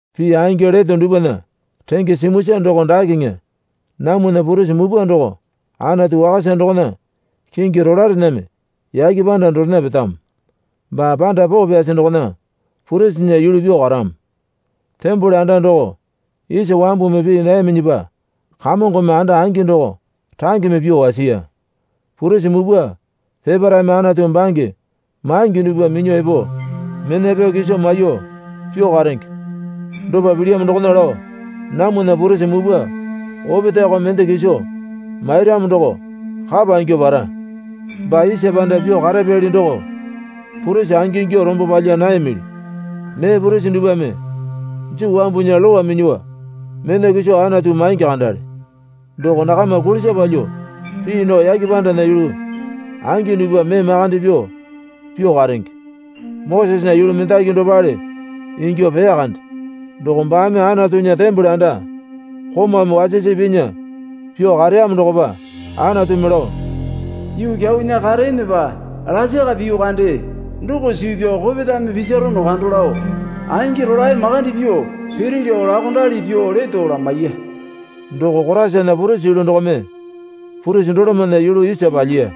Pii angi leto dupwana renge simuisa doko dakeŋe. Namwana purisi mupwa doko Anatu wakasa dokona kingi rolaerename yake panda dorena petamo. Baa panda poo pyasi dokona purisinya yulu pyuo karamo. Tembole anda doko isa wambumi pii nayaminyipa Kamongome anda angi doko rangeme pyuo wasiya. Purisi mupwa peparaeme Anatu bange maingi dupwa minyuo epo mena pyao kiso maiyuo pyuo karenge. Dopa pilyamo dokona lao namwana purisi mupwa opetaeko mende kiso mairamo doko kapa ingyuo para. Baa isa panda pyuo karapyali doko purisi angingyuo rombo palya nayamili. Mee purisi dupwame Juu wambunya Lowa minyuo mena kiso Anatu maingi kandale. Doko nakama kulisa palyuo pii nao yake pandana yulu angi dupwa mee makande pyuo pyuo karenge. Mosesena yulu mendaki dopale ingyuo peya kande. Doko baame Anatunya tembole anda komaume wasisi pinya pyuo kareyamo dokopa Anatumi lao, Yuu kyaunya kareenepa lasaka piyu kande doko suu pyao kopetame pisarono kando lao angi rolae makande pyuo piri lao laokondali pyuo leto lamaiya. Doko Koraisana purisi yulu dokome purisi dolomana yulu isa palyiya.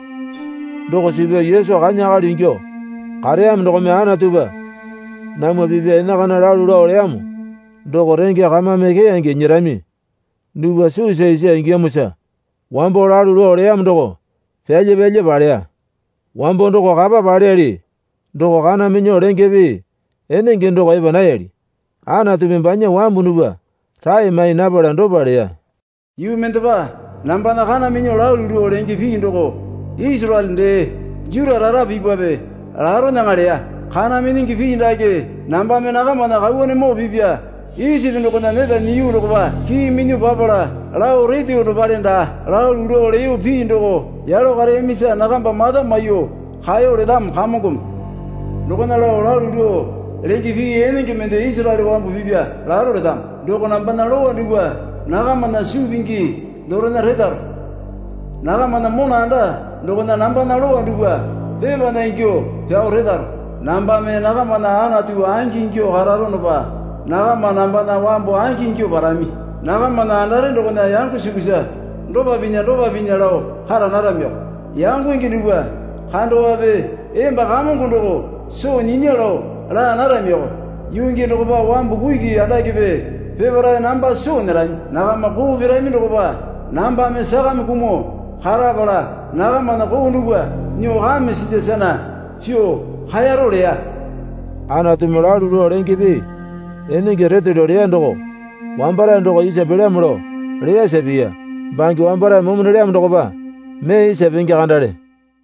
Doko suu pyao Yesu kanya akali ingyuo kareyamo dokome Anatupa namwa pipa enakana lalu lao leyamo doko renge kamame keyange nyerami dupwa suusa isa ingiyamosa wambo lalu lao leyamo doko pyalya pyalya paleya Wambo doko kapa paleyali doko kana minyuo lenge pii enenge doko epa nayali. Anatumi banya wambu dupwa rae mai napala dopa leya. Yuu mendepa nambana kana minyuo lalu lao lenge pii doko Isaraele dee Juta rara pipape laronyaŋa leya. Kana minyingi pii dake nambame nakamana kauwanemoo pipa Isipi dokona neta nyiyu dokopa kii minyuo papala lao reteyo dopale daa. Lalu lao leyo pii doko yalo kareyamisa nakamba mata maiyuo kaeyo letamo Kamongome. Dokona lao lalu lao lenge pii enenge mende Isaraele wambu pipa laro letamo. Doko nambana lowa dupwa nakamana suu pingi dorena retaro. Nakamana mona anda dokona nambana lowa dupwa pepana ingyuo pyao retaro. Nambame nakamana Anatu angingyuo kararonopa nakama nambana wambu angingyuo parami. Nakamana andare dokona yango sukusa dopa pinya dopa pinya lao kara naramioko. Yangonge dupwa kandowape emba Kamongo doko soo nyinya lao laa naramioko. Yuu gii dokopa wambu kuki andakepe peparae namba soo nyerami. Nakama koo pirami dokopa nambame sakame kumuo karapala nakamana koo dupwa nyuo kame silya sana pyuo kaeyaro leya. Anatumi lalu lao lenge pii enenge retelyo leya doko wambarae doko isa pelyamo lao leyasa piya. Bange wambarae momo nelyamo dokopa mee isa penge kandale.